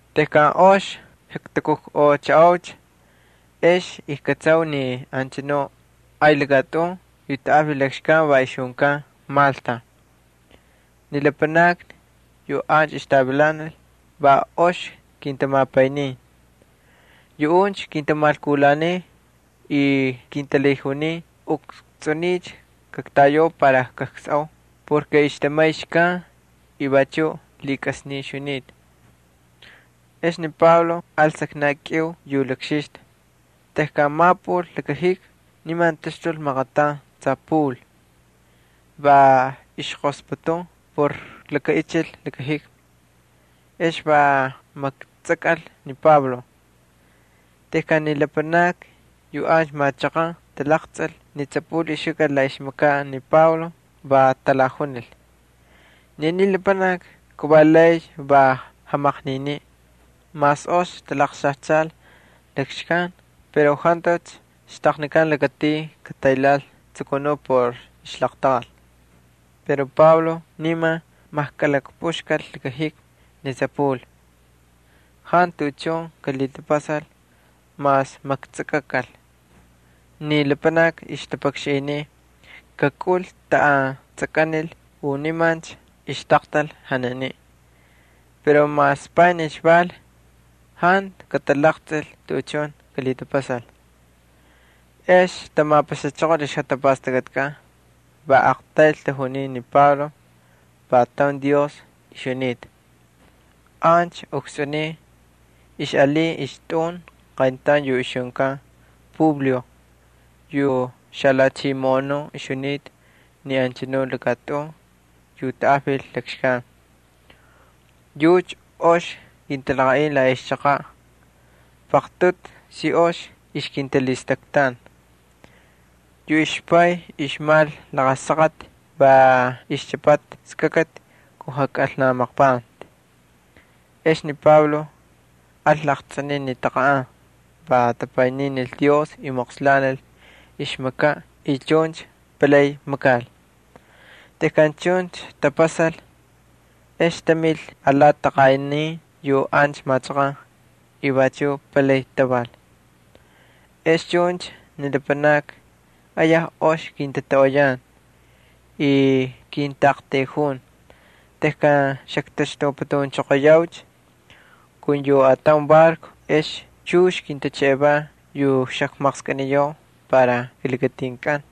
Tejkan ox ktakukꞌoꞌchaꞌaucha, ex kꞌatsau ni anchanuꞌ ay lakatꞌun yu tanꞌajvil lakxkan va ixjunkan Malta. Ni lapanakni yu ancha ixtavilanal va ox kintamapaynin. Yuꞌuncha kintamalkulanin y kintalhijunin ukstsꞌuniy kaktayau para kaksꞌoo porke ixtamay xkan y vachuꞌ lhikꞌasnin ixjunita. Ex Pablo al saknaꞌ kꞌiu yu lakxixta. Tejkan mapꞌul laka jikmi niman taxtul maqataun tsapul, va ixqosputun por lakaꞌichil laka jikmi, ex va maktsakꞌal ni Pablo. Tejkan ni lapanakni yu ancha machaqan talaqtsꞌil ni tsapul ixjukꞌal la ixmakaꞌ ni Pablo va talajunil: —Ni aniy lapanaki kavalay va jamaqniniꞌ. Mas ox talaqxajchal lakamar pero jantucha xtaqnikan lakatin kataylhaꞌal tsukunuꞌ por ixlaqtaqal. Pero Pablo niman majkꞌalhapꞌuxkal laka jikmi ni tsapul y jantu tuꞌuchun kalhitapasal mas maktsakꞌakal. Ni lapanakni ixtapakxanꞌiy kakꞌunlhi taꞌan tsakꞌanikal u nimancha ixtaqtal janiniꞌ. Pero mas panijcha val, jantu katalaqtsꞌil tuꞌuchun kalhitapasal. Ex tamapaxachoqol ixjatapastakꞌatkꞌan, va aqtayl tajuniy ni Pablo va taun dios ixjunita. Ancha ukstsꞌuniy ixꞌalin ixtꞌun qayntaun yu ixjunkan Publio yu xalhachimoꞌonuꞌ ixjunita ni anchanu lakatꞌun yu tanꞌajvil lakxkan. Yucha ox kintalaqaꞌin la ixchaqaꞌ, paqtꞌutu si ox ixkintalhistaktan. Yu ixpay ixmal laqa saqati va ixchꞌapata skakati kun jakꞌalnamaqpanti. Ex ni Pablo al laqtsꞌiniꞌ ni taqanꞌan, va tapayninil Dios y moqslanil ixmakaꞌ y chuncha palay makal. Tejkan chuncha tapasal, ex tamil alati taqanꞌanin yu ancha machaqan y vachuꞌ palay taval. Ex chuncha ni lapanakni ayaj ox kintatoꞌoyan y kintaꞌaqtayjun. Tejkan xaktaxtuputunchoqoyaucha kun yu ataun barco ex chux kintaxtaqnin yu xakmaqskꞌiniyau para kilakatinkꞌan.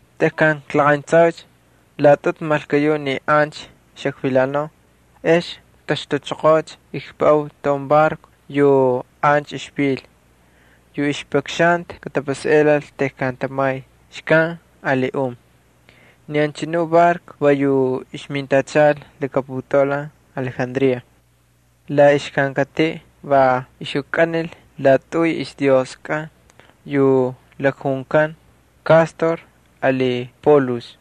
Tejkan klaqayntsaucha laꞌatꞌutu malkuyuꞌ ni ancha xakvilanau ex ktaxtuchoqoocha. Kpuꞌau taun barco yu ancha ixvil yu ixpakxanta katapasaꞌelal tejkan tamay xkan ali un. Ni anchanu barco va yu ixmintachal laka putaulan Alejandría. La ixkankatiꞌ va ixjukꞌanil laꞌatꞌuy ixdioskꞌan yu lakjunkan Cástor ali Polux.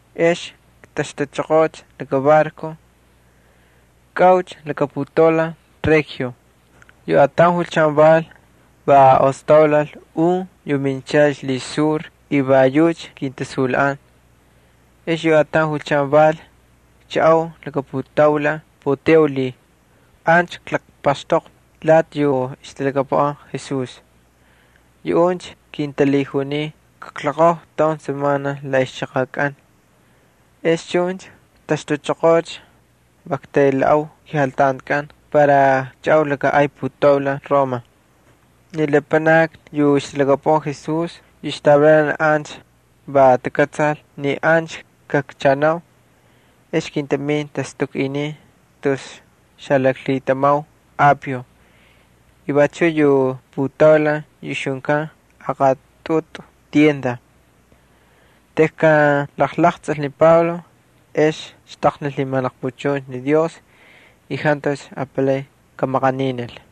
Astan ikpuꞌanchoqoocha barco, kꞌaucha laka putaulan Regio. Yu ataun julchan val, va ostaulal un yu minchal ixlhisur y va yucha kintasunlhaꞌan. Ex yu ataun julchan val, kchaꞌau laka putaulan Puteoli. Ancha klaqpaxtoqvi lati yu ixtalhakapuꞌan Jesús. Yuꞌuncha kintalhijunin kakloqojvi taun semana la ixchaqakꞌan. Ex chuncha ktaxtuchoqoo, va ktaylhaꞌau kejaltantikꞌan para kchaꞌau laka ay putaulan Roma. Ni lapanakni yu ixtalhakapuꞌan Jesús yu ixtavilanal ancha va takꞌatsal ni ancha kakchaꞌanau. Ex kintamin tastukꞌinin tus xalaklhitamau Apio y vachuꞌ yu putaulan yu ixjunkan Aqatꞌutu Tiendas. Tejkan ni Pablo jalaqtsꞌil ex xtaqnil lhimalaqpuchuncha ni Dios y jantucha apalay kamaqaninil.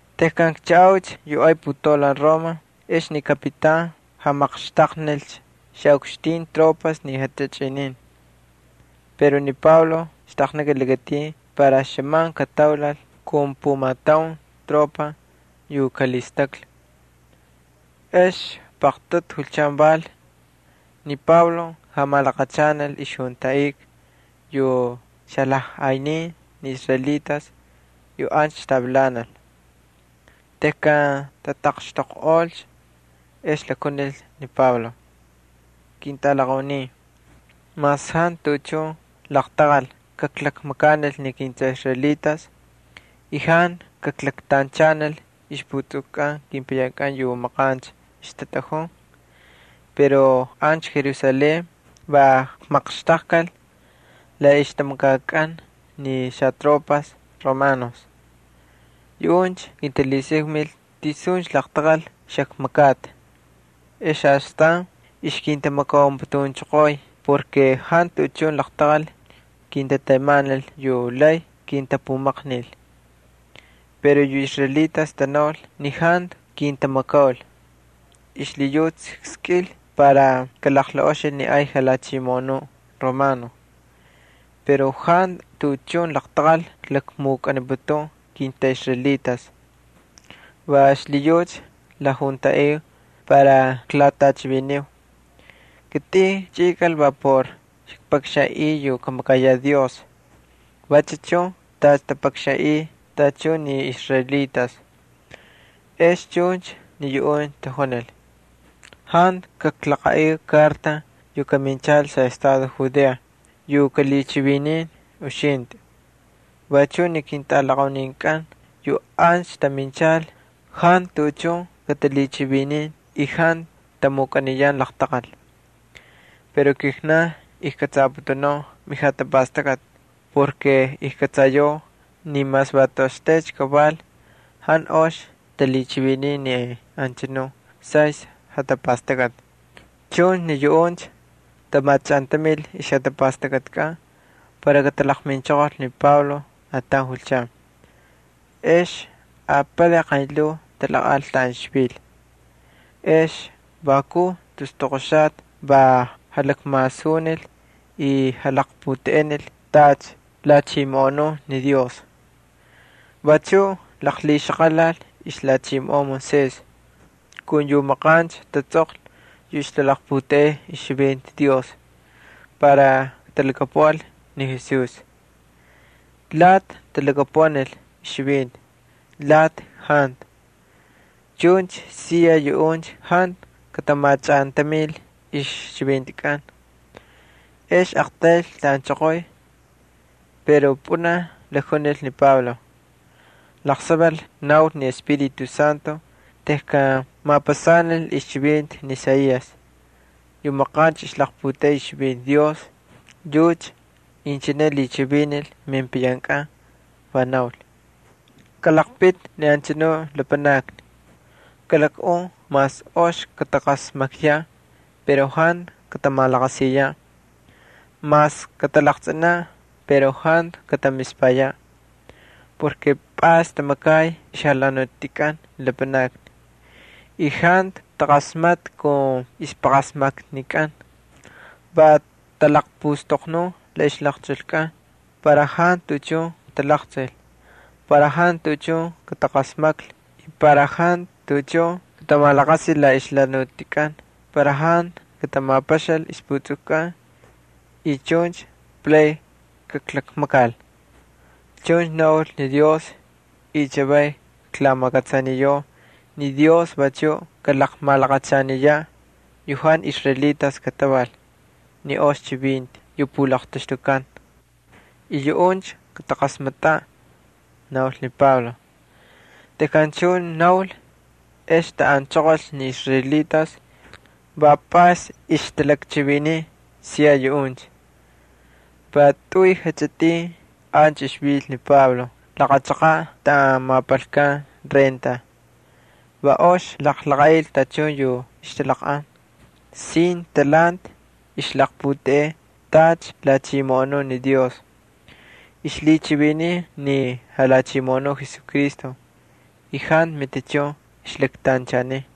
Tejkan kchaꞌaucha yu ay putaulan Roma ex ni kapitan jamaqxtaqnilcha xaꞌukxtin tropas ni tachꞌinin. Pero ni Pablo xtaqnikal lakatin para xꞌaman kataulal kun pumataun tropa yu kalhistaklhi. Ex paqtꞌutu julchan val, ni Pablo jamalaqachanal ixjuntaꞌika yu xalajꞌaynin ni israelitas yu ancha ixtavilanal. Tejkan tataqxtoqꞌolcha, ex lakjunil ni Pablo: —Ketꞌalaqaunin, mas jantu tuꞌuchun laqtaqal kaklakmakanil ni kintꞌaꞌisraelitas y jantu kaklaktanchanil ixputsukukꞌan kepayankꞌan yu maqancha ixtatꞌajun pero ancha Jerusalén va kmaqxtaqkal la ixtamakakꞌan xatropas Romanos. Yuꞌuncha kintalhisakmil tisuncha laqtaqal xakmakata. Ex astan ixkintamakaunputunchoqoy porke jantu tuꞌuchun laqtaqal kintatemanil yu lay kintapumaqnil. Pero yu israelitas tanaul ni jantu kintamakaul. Xlhiyucha kskꞌil para kalaqlaꞌoxil ni ay jalhachimoꞌonuꞌ Romano. Pero jantu tuꞌuchun laqtaqal klakmukꞌaniputun kintꞌaꞌisraelitas. Va xlhiyucha klajuntaꞌiu para kaklatꞌachiviniu. Kitꞌin kchꞌikal va por kpakxanꞌiy yu kamakayaꞌ Dios vachu chun tacha tapakxanꞌiy tachun ni israelitas. Ex chuncha ni yuꞌuncha tajunil: —Jantu kaklaqaꞌiu karta yu kaminchal xaꞌestado Judea yu kalhichivinin uxintꞌi. Vachuꞌ ni ketꞌalaqauninkꞌan yu ancha taminchal jantu tuꞌuchun katalhichivinin, jantu tamukꞌaniyan laqtaqal. Pero kijnan ijkꞌatsaputunau mejatapastakꞌati porke ijkꞌatsayau ni mas va toꞌoxtaycha kaval jantu ox talhichiviniy ni anchanuꞌ saystꞌi jatapastakꞌati. Chuncha ni yuꞌuncha tamachꞌantamil ixjatapastakꞌatikꞌan para katalaqminchoqol ni Pablo ataun julchan. Ex apalay qaynlhuu talaqꞌal taꞌan ixvil. Ex vakuj tus toqoxata va jalakmasunil y jalaqputeꞌenil tacha lhachimoꞌonun ni Dios. Vachuꞌ laqlhixaqalal ixlhachimoꞌon Moisés kun yu maqancha tatsꞌoqlhi xalaqputeꞌeniꞌ ixchivinti Dios para katalhakapuꞌal ni Jesús. Lati talhakapuꞌanil ixchivinti, lati jantu. Chuncha siya yuꞌuncha jantu katamachꞌantamil ixchivintikꞌan. Ex aqtaylcha taꞌanchoqoy. Pero pꞌunaj jalakjunil ni Pablo: —Laqsaval naul ni Espíritu Santo tejkan mapasanil ixchivinti ni Isaías yu maqancha ixlaqputeꞌey ixchivinti Dios, yucha inchine lhichivinil mepayankꞌan, va naul: Kꞌalaqpiti ni anchanu lapanakni, kalakꞌun mas ox kataqasmakyaꞌ pero jantu katamalaqasiyaꞌ, mas katalaqtsꞌinaꞌ pero jantu katamispayaꞌ. Pꞌays tamakay ixjalhanutikꞌan ni lapanakni, jantu taqasmatꞌa kun ixpaqasmaknikꞌan, va talaqpustoqnun la ixlaqchulkꞌan, para jantu tuꞌuchun katalaqtsꞌil, para jantu tuꞌuchun kataqasmaklhi, para jantu tuꞌuchun katamalaqasil la ixjalhanutikꞌan, para jantu katamapaxal ixputsukukꞌan y chuncha palay kaklakmakal. Chuncha naul ni Dios y chavay klamakꞌatsaniyau ni Dios vachuꞌ kalaqmalaqachaniyaꞌ yu jantu israelitas kataval ni ox chivinti yu pulaqtaxtukan. Yuꞌuncha kataqasmatꞌaꞌ —naul ni Pablo. [ Tejkan chuncha naul, ex taꞌanchoqolcha ni israelitas, va pꞌays ixtalakchiviniy siya yuꞌuncha.] Va tꞌuy jachꞌitin ancha ixvil ni Pablo laqa chaqaꞌ taꞌan mapalkan renta. Va ox jalaqaꞌil tachun yu ixtalaqꞌan. Sin talhanti ixlaqputeꞌey tacha lhachimoꞌonun ni Dios, ixlhichiviniy ni Jalhachimoꞌonuꞌ Jesucristo y jantu matichun ixlaktanchaniy.